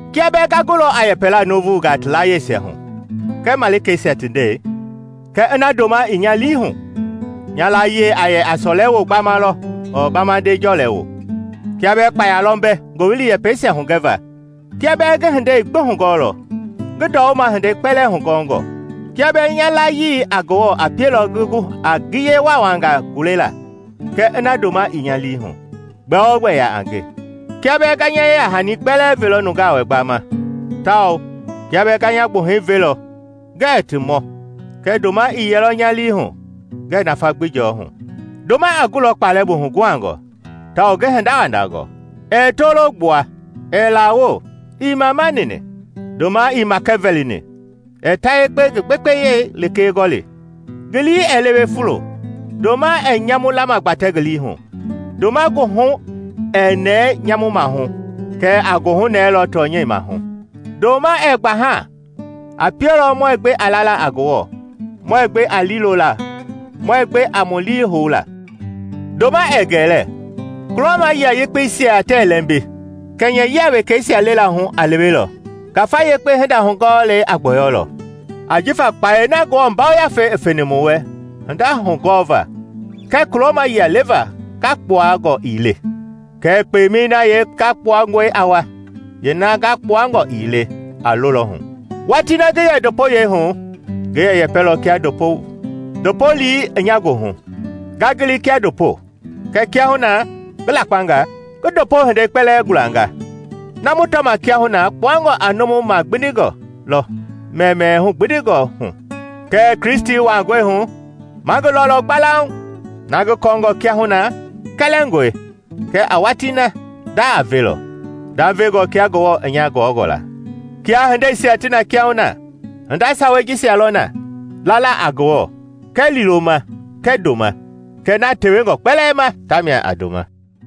Kia bɛɛ nga gulɔ a yɛpɛla nuuvungaa ti layiesia hu kɛɛ malikeisia ti ndɛi, kɛɛ ina ndoma ii nya lii hu, nya layie a yɛ a sɔlewoo gbama lɔ ɔɔ bamande jɔlɛwoo. Kia bɛɛ kpaya lɔ mbɛ ngowili yɛpɛisia hugɛva; kia bɛɛ ngi hindei gbi hugɔɔlɔ, ngi ndɔwuma hindei kpɛlɛɛ hugɔngɔ; kia bɛɛ nya layii a Ngewɔ a pielɔ ngi gu a ngiye waawangaa gulela, kɛɛ ina ndoma ii nya lii hu, gbɛogbɛ yaa a nge. Kia bɛɛ nga nya yeya-hani kpɛlɛɛ velɔ nungaa wɛ gbama tawao kia bɛɛ nga nya gbuhɛi velɔ ngɛɛ ti mɔ, kɛɛ ndoma i yɛlɔ nya lii hu, ngɛɛ nafa gbi jɔɔ hu. Ndoma a gulɔ kpalɛ bu huguhangɔ tawao ngi hindawandangɔ ɛɛ tolo gbua, ɛɛ lawo, ii mamanini; ndoma ii makɛvɛlini, ɛɛ ta yekpe ngi gbekpeyei lekee gɔli, ngi lii ɛɛ lewe fulo, ndoma ɛɛ nyamu lamagbatɛ ngi lii hu; ndoma goohu ɛɛ nɛɛ nyamu maahu kɛɛ a goohunɛɛlɔ tɔnyɛi maahu. Ndoma ɛɛ gbaha; a pielɔ muɛɛ gbe a lala a Ngewɔ, muɛɛ gbe a liilolaa, muɛɛ gbe a mu lii houla. Ndoma ɛɛ gɛlɛ. Kulɔma yia yɛpeisa tɛɛ lɛmbi; kɛnyɛyia wekeisia lelaa hu a lewelɔ; ngafa yekpe hinda hugɔɔlei a gbɔyɔlɔ. Ajifa kpayei na Ngewɔ Yafei i feni mu wɛ hinda hugɔva kɛɛ kulɔma yia leva ngakpuangɔ ii le; kɛɛ kpemei na yeengakpuangɔi a wa, yeena ngakpuangɔ ii le a lolɔ hu. Watii na ngi yɛ ndopoyɛi hu, ngi yɛ yɛpɛlɔ kia ndopo, ndopo lii i nya goohu, nga gili kia ndopo; kɛɛ kiahuna na ngi lakpangaa, ngi ndopo hindei kpɛlɛɛ gulanga. Na mu tɔma kiahuna kpuangɔ a numu magbindingɔ lɔ mɛmɛɛ hugbindingɔ hu; kɛɛ Kristi wangɔi hu, ma ngi lɔlɔ gbalauŋ. Na ngi kɔɔngɔ kiahuna, kɛlɛngɔe; kɛɛ a watii na, nda a velɔ, ndavengɔ kia Ngewɔ i nya gɔngɔ la. Kia hindeisia ti na kiahuna, hinda sawei jisia lɔ na: lala a Ngewɔ kɛɛ liiloma kɛɛ ndoma; kɛɛ na tewengɔ ti kpɛlɛɛ ma tamia a ndoma.